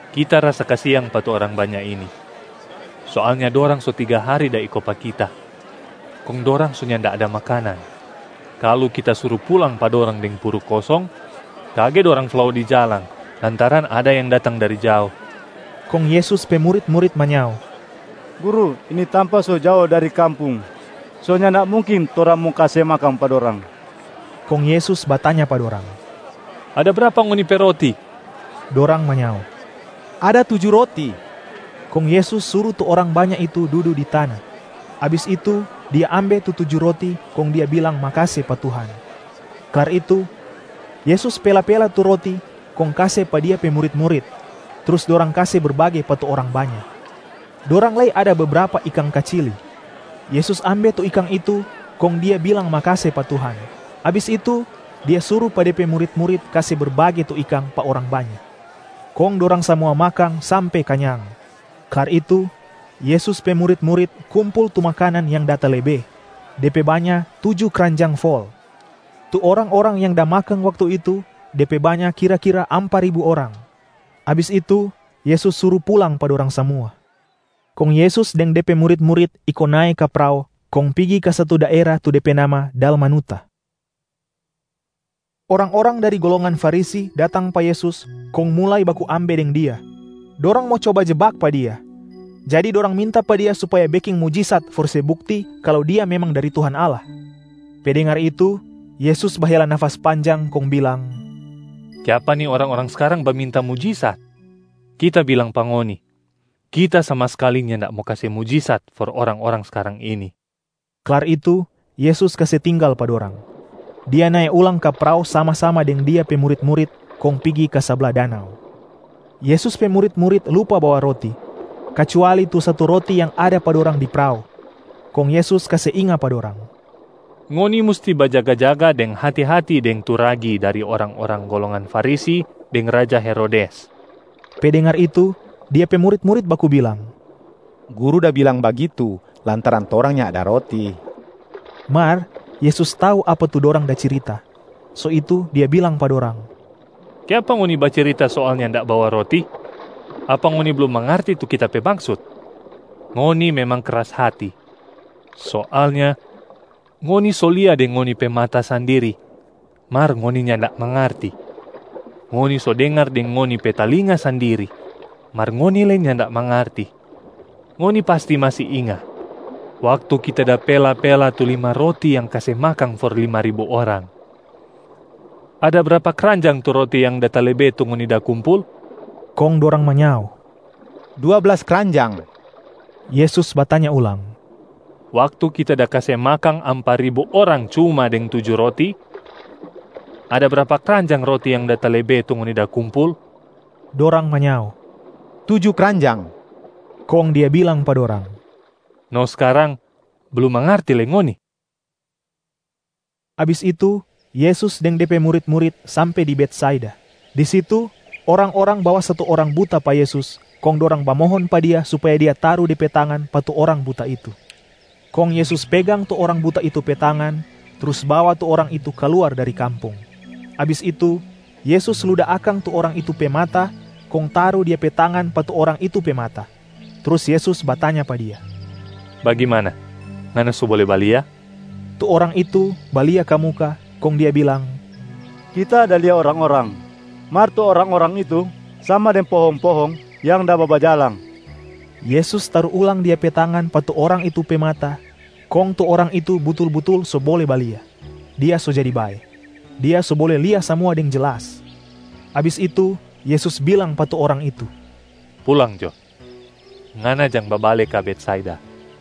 “Kita rasa kasiang pa tu orang banya ini. Soalnya dorang so tiga hari da iko pa Kita kong dorang so nyanda ada makanan. Kalu Kita suru pulang pa dorang deng puru kosong, kage dorang flao di jalang lantaran ada yang datang dari jao.” Kong Yesus pe murit-murit manyao, “Guru, ini tampa so jao dari kampung, so nyanda mungkin torang mo kase makang pa dorang.” Kong Yesus batanya pa dorang, “Ada brapa ngoni pe roti?” Dorang manyao, “Ada tuju roti.” Kong Yesus suru tu orang banya itu dudu di tana. Abis itu Dia ambe tu tuju roti kong Dia bilang makase pa Tuhan. Klar itu, Yesus pela-pela tu roti kong kase pa Dia pe murit-murit, trus dorang kase berbage pa tu orang banya. Dorang lei ada bebrapa ikang kacili. Yesus ambe tu ikang itu kong Dia bilang makase pa Tuhan, abis itu Dia suru pa De pe murit-murit kase berbage tu ikang pa orang banya. Kong dorang samua makang sampe kanyang. Klar itu, Yesus pe murit-murit kumpul tu makanan yang da talebe, de pe banya tuju kranjang fol. Tu orang-orang yang da makang waktu itu, de pe banya kira-kira ampa ribu orang. Abis itu Yesus suru pulang pa dorang samua. Kong Yesus deng De pe murit-murit iko nae ka prao kong pigi ka satu daera tu de pe nama Dalmanuta. Orang-orang dari golongan Farisi datang pa Yesus kong mulai baku ambe deng Dia. Dorang mo coba jebak pa Dia, jadi dorang minta pa Dia supaya beking mujisat for se bukti kalu Dia memang dari Tuhan Allah. Pe dengar itu, Yesus bahela nafas panjang kong bilang, “Kiapa ni orang-orang skarang baminta mujisat? Kita bilang pa ngoni, Kita sama skali nyanda mo kase mujisat for orang-orang skarang ini.” Klar itu, Yesus kase tinggal pa dorang. Dia nae ulang ka prao sama-sama deng Dia pe murit-murit kong pigi ka sabla danau. Yesus pe murit-murit lupa bawa roti, kacuali tu satu roti yang ada pa dorang di prao. Kong Yesus kase inga pa dorang, “Ngoni musti bajaga-jaga deng hati-hati deng tu ragi dari orang-orang golongan Farisi deng raja Herodes.” Pe dengar itu, Dia pe murit-murit baku bilang, “Guru da bilang bagitu, lantaran torang nyanda ada roti.” Mar Yesus tau apa tu dorang da cirita, so itu Dia bilang pa dorang, “Kiapa ngoni bacirita soal nyanda bawa roti? Apa ngoni blum mangarti tu Kita pe maksut? Ngoni memang kras hati. Soalnya, ngoni so lia deng ngoni pe mata sandiri mar ngoni nyanda mangarti. Ngoni so dengar deng ngoni pe talinga sandiri mar ngoni lei nyanda mangarti. Ngoni pasti masi inga waktu Kita da pela-pela tu lima roti yang kase makang for lima ribu orang. Ada brapa kranjang tu roti yang da talebe tu ngoni da kumpul?” Kong dorang manyao, “Dua blas kranjang.” Yesus batanya ulang, “Waktu kita da kase makang ampa ribu orang cuma deng tuju roti, ada brapa kranjang roti yang da talebe tu ngoni da kumpul?” Dorang manyao, “Tuju kranjang.” Kong Dia bilang pa dorang, “No skarang, blum mangarti lei ngoni?” Abis itu Yesus deng De pe murit-murit sampe di Betsaida. Di situ orang-orang bawa satu orang buta pa Yesus kong dorang bamohon pa Dia supaya Dia taru De pe tangan pa tu orang buta itu. Kong Yesus pegang tu orang buta itu pe tangan, trus bawa tu orang itu kaluar dari kampung. Abis itu, Yesus luda akang tu orang itu pe mata kong taru Dia pe tangan pa tu orang itu pe mata, trus Yesus batanya pa dia, “Bagimana, ngana so bole balia?” Tu orang itu balia ka muka, kong dia bilang, “Kita da lia orang-orang, mar tu orang-orang itu sama deng pohong-pohong yang da babajalang.” Yesus taru ulang Dia pe tangan pa tu orang itu pe mata, kong tu orang itu butul-butul so bole balia, dia so jadi bae. Dia so bole lia samua deng jelas. Abis itu Yesus bilang pa tu orang itu, “Pulang jo, ngana jang babale ka Betsaida.”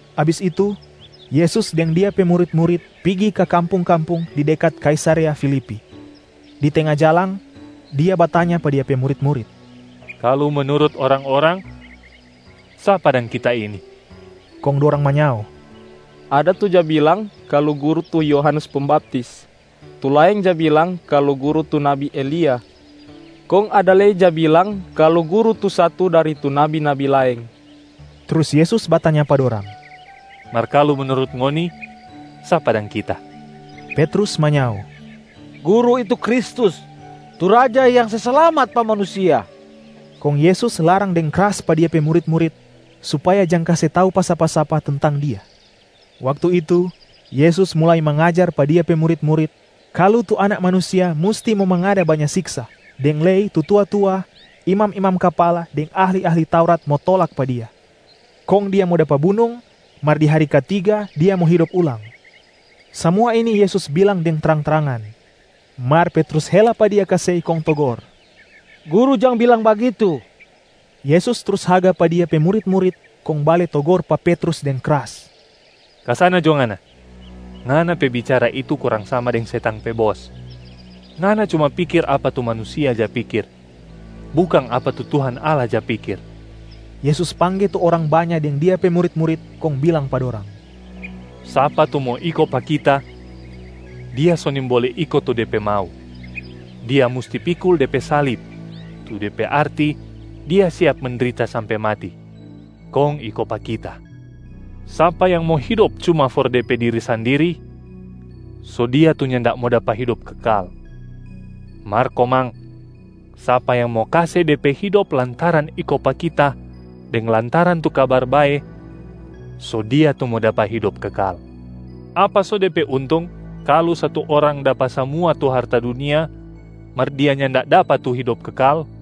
Abis itu, Yesus deng Dia pe murit-murit pigi ka kampung-kampung di dekat Kaisarea Filipi. Di tenga jalang, Dia batanya pa Dia pe murit-murit, “Kalu menurut orang-orang, sapa dang Kita ini?” Kong dorang manyao, “Ada tu ja bilang kalu Guru tu Yohanes Pembaptis, tu laeng ja bilang kalu Guru tu nabi Elia, kong ada lei ja bilang kalu Guru tu satu dari tu nabi-nabi laeng.” Trus Yesus batanya pa dorang, “Mar kalu menurut ngoni, sapa dang Kita?” Petrus manyao, “Guru itu Kristus tu Raja yang se slamat pa manusia!” Kong Yesus larang deng kras pa Dia pe murit-murit supaya jang kase tau pa sapa-sapa tentang Dia. Waktu itu Yesus mulai mangajar pa Dia pe murit-murit kalu tu Anak Manusia musti mo mangada banya siksa, deng lei tu tua-tua, imam-imam kapala deng ahli-ahli Taurat mo tolak pa Dia. Kong Dia mo dapa bunung, mar di hari katiga Dia mo hidop ulang. Samua ini Yesus bilang deng trang-trangan. Mar Petrus hela pa Dia ka sei kong togor, “Guru, jang bilang bagitu.” Yesus trus haga pa Dia pe murit-murit kong bale togor pa Petrus deng kras, “Ka sana jo ngana! Ngana pe bicara itu kurang sama deng setang pe bos. Ngana cuma pikir apa tu manusia ja pikir, bukang apa tu Tuhan Allah ja pikir.” Yesus pangge tu orang banya deng Dia pe murit-murit kong bilang pa dorang, “Sapa tu mo iko pa Kita, dia so nimbole iko tu de pe mau, dia musti pikul de pe salib tu de pe arti dia siap mendrita sampe mati, kong iko pa Kita. Sapa yang mo hidop cuma for de pe diri sandiri, so dia tu nyanda mo dapa hidop kekal. Mar komang, sapa yang mo kase de pe hidop lantaran iko pa Kita deng lantaran tu Kabar Bae, so dia tu mo dapa hidop kekal. Apa so de pe untung kalu satu orang dapa samua tu harta dunia, mar dia nyanda dapa tu hidop kekal?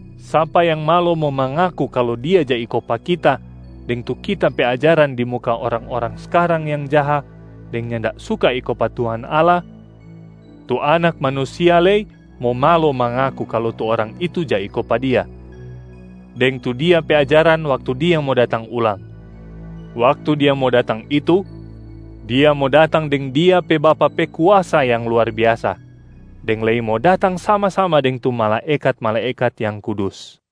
Sapa yang malo mo mangaku kalu dia ja iko pa Kita deng tu Kita pe ajaran di muka orang-orang skarang yang jaha deng nyanda suka iko pa Tuhan Allah, tu Anak Manusia lei mo malo mangaku kalu tu orang itu ja iko pa Dia deng tu Dia pe ajaran waktu Dia mo datang ulang. Waktu Dia mo datang itu, Dia mo datang deng Dia pe Bapa pe kuasa yang luar biasa deng lei mo datang sama-sama deng tu malaekat-malaekat yang kudus.”